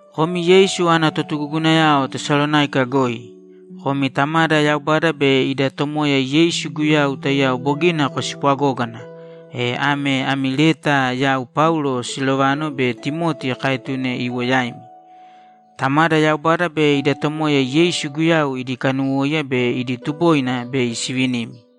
Komi Yeisu ana totugugunayao Tesalonáika goi, Komi Tamada Yaubada be ida Tomoya Yeisu Guyau taiyao bogina kospwagógana, e ame ami leta yau Paulo, Silovano be Timoti kaetune iwo yaimi. Tamada Yaubada be ida Tomoya Yeisu Guyau idi kanuwóiya be idi tuboina bei sivinimi.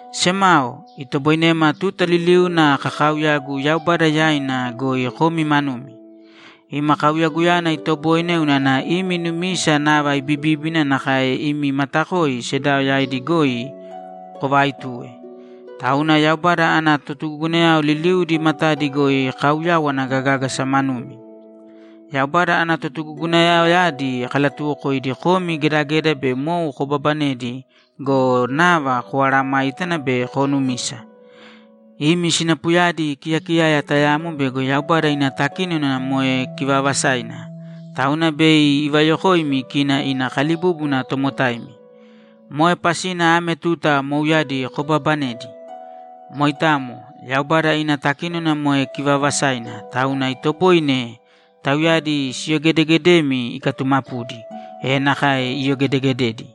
Semao, itoboinema tuta liliuna kakaauyagu Yaubada yaina goi komi manumi. Ima kauyaguyana itoboine unana imi numisa nava ibibíbina nakae imi matakoi sedao yaidi goi kovaaituwe. Tauna Yaubada ana totugugunayao liliudi matadi goi kauyawana gagágasa manumi. Yaubada ana totugugunayaoyadi kalatuwokoidi komi gedageda be mou kobaabanedi go, nava komeesayágana be koonumisa. Imi sinapuyadi kiyakiyaya tayamo bego Yaubada ina takínona moe kivaavasaina, tauna bei ivayokoimi kina ina kalibúbuna tomotaimi. Moe pasina ame tuta mouyadi kobaabanedi. Moitamo. Yaubada ina takínona moe kivaavasaina, tauna itoboine tauyadi siyogedeegedemi ikatumapudi, e nakae iyogedegededi.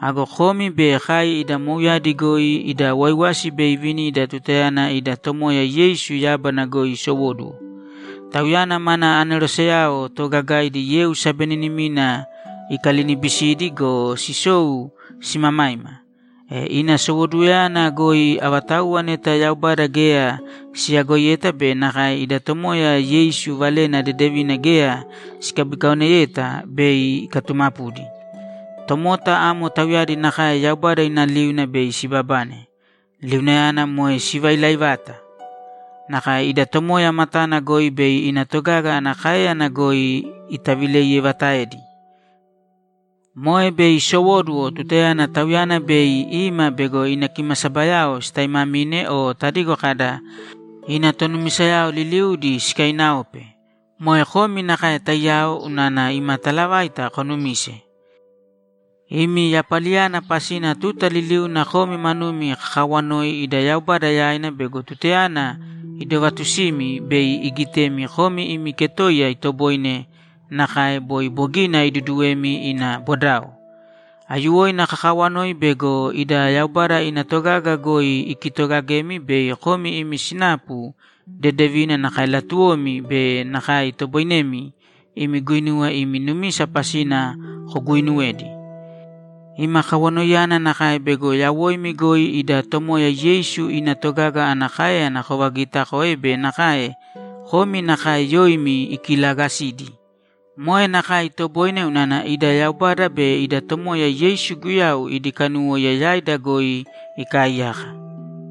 Ago komi be kai ida mouyadi goi ida waiwasi bei ivinida tutayana ida Tomoya Yeisu yábana goi isowóduwo. Tauyana mana aneroseyao toogagaidi yeu sabeninimina ikalinibisidi go, sisou simamaima. E ina sowoduwoyana goi avatauwa neta Yaubada geya siyagoiyeta be nakae ida Tomoya Yeisu Valena Dedevina geya sikabikaoneyeta, bei ikatumapudi. Tomota amo tauyadi nakae Yaubada ina liuna bei sibabane. Liunayana moe sivailai vata. Nakae ida Tomoya matana goi be ina togaga ana káeyana goi itavileiyevataedi. Moe bei isowóduwo tutayana Tauyana bei ima bego ina kimasabayao sitaimamine o tadigo kada, ‘Ina tonumisayao liliudi sikainaope.’ Moe komi nakae taiyao unana ima talavaita konumise. Imi yapaliyana pasina tuta liliuna komi manumi kakaawanoi ida Yaubada yaina bego tutayana idovatusimi, bei igitemi komi imi ketoiya itoboine nakae boi bogina iduduwemi ina bodao. Aiyuwoina kakawanoi bego ida Yaubada ina togaga goi ikitoogagemi bei komi imi sinapu dedevina nakae latuwomi be nakae itoboinemi imi guinuwa imi numisa pasina koguuinuwedi. Ima kawanoiyana nakae bego yawoimi goi ida Tomoya Yeisu ina togaga ana káeyana kovagiitakoe be nakae komi nakae yoimi ikilaagasidi. Moe nakae itoboine unana ida Yaubada be ida Tomoya Yeisu Guyau idi kanuwóiya yaida goi ikaaiyaka.